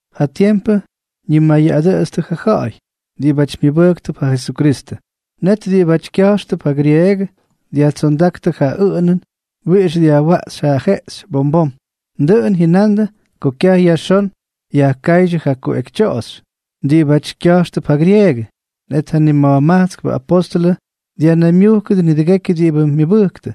Ja tiempʉ ñimayʉꞌadʉtstʉ ja ja̱ꞌa̱y diꞌibʉty myʉbʉjktʉp ja Jesukristʉ. Net diꞌibáty kya̱jxtʉp ja grieegʉ dyajtsondáktʉ ja ʉꞌʉnʉn wiꞌix dyajwaꞌxy ja jeꞌxy bom bom. Dʉꞌʉn jyʉnandʉ ko kyaj yajxón yajkáydyʉ ja kuꞌekytyoꞌoxy diꞌibáty kya̱jxtʉp ja grieegʉ. Net ja nima̱jmajtskpʉ apóstʉlʉ dyajnaymyujkta̱a̱yʉdʉ nidʉgekyʉ diꞌibʉ myʉbʉjktʉ,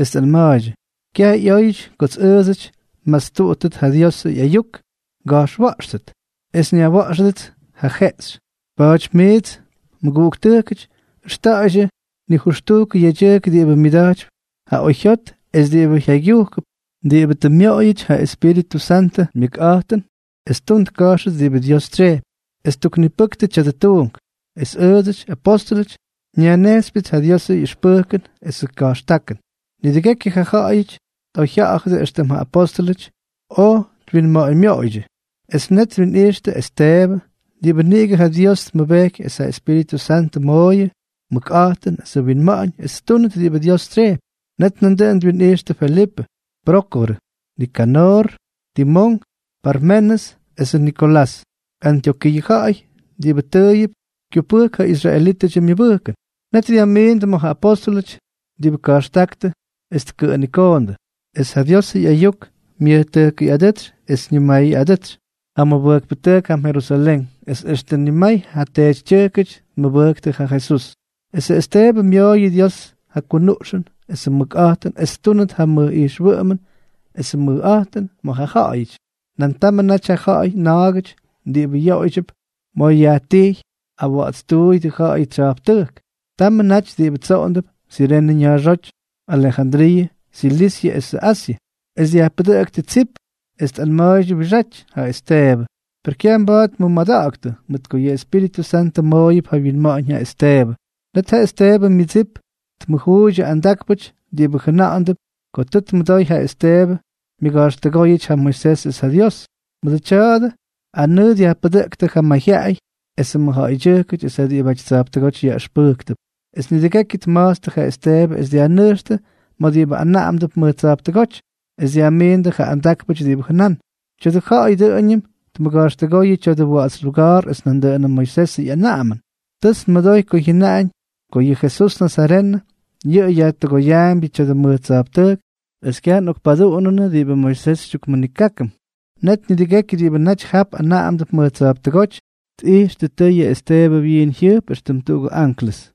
es tꞌanma̱a̱ydyʉ: —Kyaj ꞌyóyʉty kots ʉʉdsʉty nmastuꞌuttʉt ja Diosʉ ꞌyayuk nga̱jxwa̱ꞌxtʉt es nyajwa̱ꞌxʉdʉts ja jeꞌxy. Pa̱a̱ty miits mʉguꞌuktʉjkʉty, ʉxta̱ꞌa̱ydyʉ nijʉxtujkʉ yedyʉjk diꞌibʉ myʉda̱jtypy ja oyjyot es diꞌibʉ jyaygyujkʉp, diꞌibʉ tʉ myoꞌoyʉty ja Espíritʉ Santʉ myʉkꞌa̱jtʉn es ttun tka̱jxtʉ diꞌibʉ Dios tsyejpy, es tuknipʉkʉ tya̱dʉ tuunk. Es ʉʉdsʉty, apóstʉlʉty, nyajnejxypyʉts ja Diosʉ ꞌyʉxpʉjkʉn esʉ ka̱jxtákʉn. Nidʉgekyʉ ja ja̱ꞌa̱yʉty tꞌoyjya̱ꞌa̱dʉ éxtʉm ja apóstʉlʉty oj twinma̱ꞌa̱ñmyoꞌoydyʉ. Es net twinꞌijxtʉ Esteebʉ, diꞌibʉ niꞌigʉ ja Dios tmʉbejky es ja Espíritʉ Santʉ mooyʉ mʉkꞌa̱jtʉn es winma̱ꞌa̱ñ es ttúnʉt diꞌibʉ Dios tsyejpy. Es nandʉꞌʉn twinꞌijxtʉ Felipʉ, Prókorʉ, Nikanoor, Timón, Parmenʉs esʉ Nikolás, Antyokiiʉ ja̱ꞌa̱y diꞌibʉ tʉʉyʉp kyupʉjk ja israelítʉdyʉ myʉbʉjkʉn. Net dyajmiindʉ ma̱ ja apóstʉlʉty, diꞌibʉ ka̱jxtáktʉ es tkʉꞌʉnikoondʉ. Es ja Diosʉ ꞌyayuk myʉjtʉjkʉyꞌadʉ́tsy es ñimayʉꞌadʉtsy ja mʉbʉjkpʉtʉjk jam Jerusalén, es extʉ nimay ja teetytyʉjkʉty tmʉbʉjktʉ ja Jesús. Esʉ Esteebʉ myooyʉ Dios ja kunuꞌxʉn esʉ mʉkꞌa̱jtʉn es ttúnʉt ja mʉj ijxwʉꞌʉmʉn esʉ mʉjꞌa̱jtʉn ma̱ ja ja̱ꞌa̱yʉty. Nan tamʉ naty ja ja̱ꞌa̱y na̱a̱gʉty diꞌibʉ yoꞌoydyʉp ma̱ yajtijy Awa̱ꞌa̱tstuuyʉdʉ Ja̱ꞌa̱yʉ Tsya̱jptʉjk. Tamʉ naty diꞌibʉ tsoꞌondʉp Sirene ña̱a̱xóty, Alejandriiʉ, Silisyʉ esʉ Asyʉ, es dyajpʉdʉꞌktʉ tsip es tꞌanma̱a̱ydyʉ wiꞌixáty ja Esteebʉ. Per kyaj mba̱a̱t tmʉmada̱ꞌa̱ktʉ, mʉt ko yʉ Espíritʉ Santʉ mooyʉp ja winma̱ꞌa̱ñ ja Esteebʉ. Net ja Esteebʉ myʉdsip tmʉjuuydyʉ andákpʉty diꞌibʉ jʉna̱ꞌa̱ndʉp ko tʉ tmʉdoy ja Esteebʉ myʉga̱jxtʉgóyʉty ja Moisés es ja Dios. Mʉdʉ tya̱dʉ anʉʉ dyajpʉdʉꞌktʉ ja mayjyaꞌay esʉ mʉjja̱ꞌa̱ydyʉjkʉty es ja diꞌibʉty tsa̱jptʉgóty yaꞌʉxpʉjktʉp. Es nidʉgekyʉ tma̱jtstʉ ja Esteebʉ es dyajnʉjxtʉ ma̱ diꞌibʉ anaꞌamdʉp mʉj tsa̱jptʉgóty. Es dyajmiindʉ ja andákpʉty diꞌibʉ jʉnán: —Tya̱dʉ ja̱ꞌa̱y dʉꞌʉñʉm tmʉga̱jxtʉgóyʉ tya̱dʉ wa̱ꞌa̱ts luga̱a̱r es nandʉꞌʉnʉ Moisesʉ ꞌyanaꞌamʉn. Tʉts nmʉdoy ko jyʉnaꞌañ ko yʉ Jesús nazarenʉ, yʉꞌʉ yajkutʉgoyaambyʉ tya̱dʉ mʉj tsa̱jptʉjk es kyaj nꞌokpaduꞌunʉnʉ diꞌibʉ Moisés xytyukmʉnikákʉm. Net nidʉgekyʉ diꞌibʉ naty jap anaꞌamdʉp mʉj tsa̱jptʉgóty, tꞌijxtʉ tʉyʉ Esteebʉ wyiin jyʉjp éxtʉm tuꞌugʉ anklʉs.